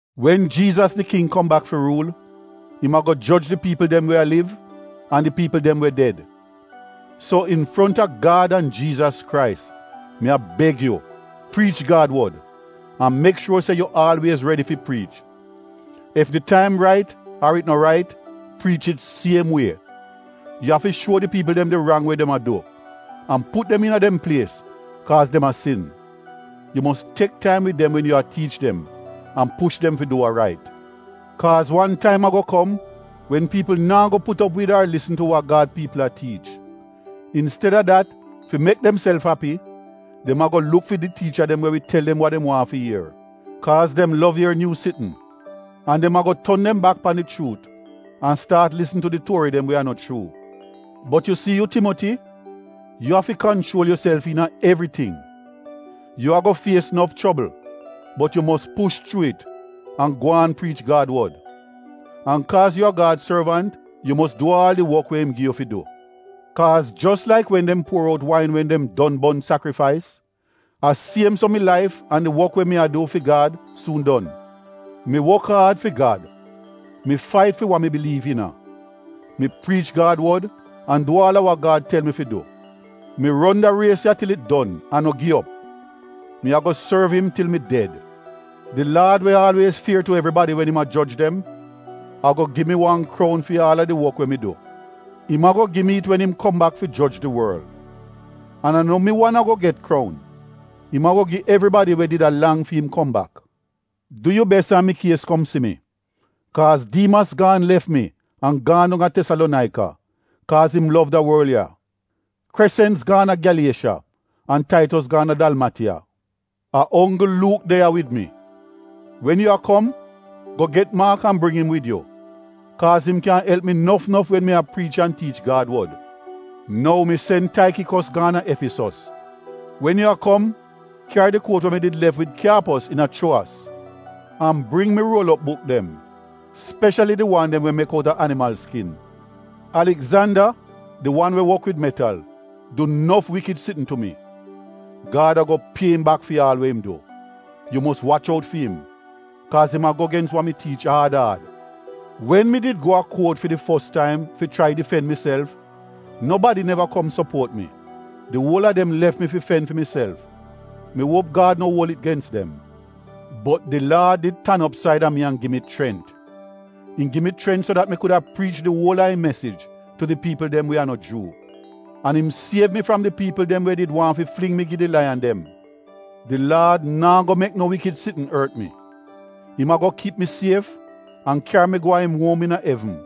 Wen Jiizas di King kom bak fi ruul, im ago joj di piipl dem we a liv an di piipl dem we ded. So infronta Gad an Jiizas Krais, mi a beg yu priich Gad wod an mek shuor se yu aalwiez redi fi priich. Ef di taim rait ar it no rait, priich it siem wie. Yu afi shuo di piipl dem di rang we dem a du an put dem iina dem plies kaaz dem a sin. Yu mos tek taim wid dem wen yu a tiich dem an push dem fi du wa rait. Kaaz wan taim ago kom wen piipl naa go put op wid ar lisn tu wa Gad piipl a tiich. Insteda dat, fi mek demself api, dem ago luk fi di tiicha dem we wi tel dem wa dem waahn fi ier, kaaz dem lov ier nyuu tingz. An dem ago ton dem bak pan di chuut an staat lisn tu di tuori dem we a no chuu. Bot yu si yu Timoti, yu afi kanchuol yuself iina evriting. Yu ago fies nof chobl bot yu mos push chuu it an gwaan priich Gad wod. An kaaz yu a Gad sorvant yu mos du aal di wok we im gi yu fi du. Kaaz jos laik wen dem puor out wain wen dem don bon sakrifais, a siem so mi laif an di wok we mi a du fi Gad suun don. Mi wok aad fi Gad; mi fait fi wa mi biliiv iina. Mi priich Gad wod an du aal a wa Gad tel mi fi du; mi ron da ries ya til it don an no gi op. Mi ago sorv im til mi ded. Di Laad we aalwiez fier tu evribadi wen im a joj dem, ago gi mi wan kroun fi aal a di wok we mi du. Im ago gi mi it wen im kom bak fi joj di worl. An a no mi wan ago get kroun, im ago gi evribadi we did a lang fi im kom bak. Du yu bes an mikies kom si mi. Kaaz Diimas gaan lef mi an gaan dong a Tesalonaika, kaaz im lov da worl ya. Kresens gaan a Gyaliesha an Taitos gaan a Dalmatiya. A onggl Luuk de ya wid mi. Wen yu a kom, go get Maak an bring im wid yu. Kaaz im kyan elp mi nof nof wen mi a priich an tiich Gad wod. Nou mi sen Taikikos gaan a Efisos. Wen yu a kom, kyari di kuot we mi did lef wid Kyaapos iina Chuowas. An bring mi ruol op buk dem, speshali di wan dem we mek outa animal skin. Aligzanda, di wan we wok wid metal, du nof wikid sitn tu mi. Gad ago pie im bak fi aal we im du. Yu mos wach out fi im, kaaz im a go gens wa wi tiich aad aad. Wen mi did go a kuot fi di fos taim fi chrai difen miself nobadi neva kom sopuot mi, di uol a dem lef mi fi fen fi miself. Mi uop Gad no uol it gens dem. Bot di Laad did tan op said a mi an gi mi chrent. Im gi mi chrent so dat mi kuda priich di uol a im mesij tu di piipl dem we a no Juu. An im siev mi fram di piipl dem we did waahn fi fling mi gi di laiyan dem. Di Laad naa go mek no wikid sitn ort mi. Im ago kip mi sief an kyari mi go a im uom iina evn.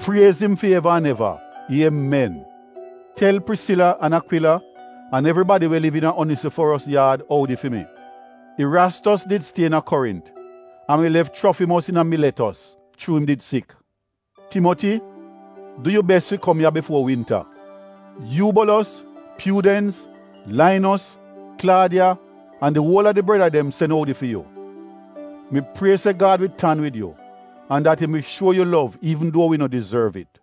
Priez im fi eva an eva! Iemen! Tel Prisila an Akwila an evribadi we liv iina Onisiforos yaad oudi fi mi. Irastos did stie iina Korint an mi lef Chrofimos iina Miletos chuu im did sik. Timoti, du yu bes fi kom ya bifuo winta. Yuubolos, Pyuudens, Lainos, Klaadiya an di uol a di breda dem sen oudi fi yu. Mi prie se Gad wi tan wid yu an bles yu.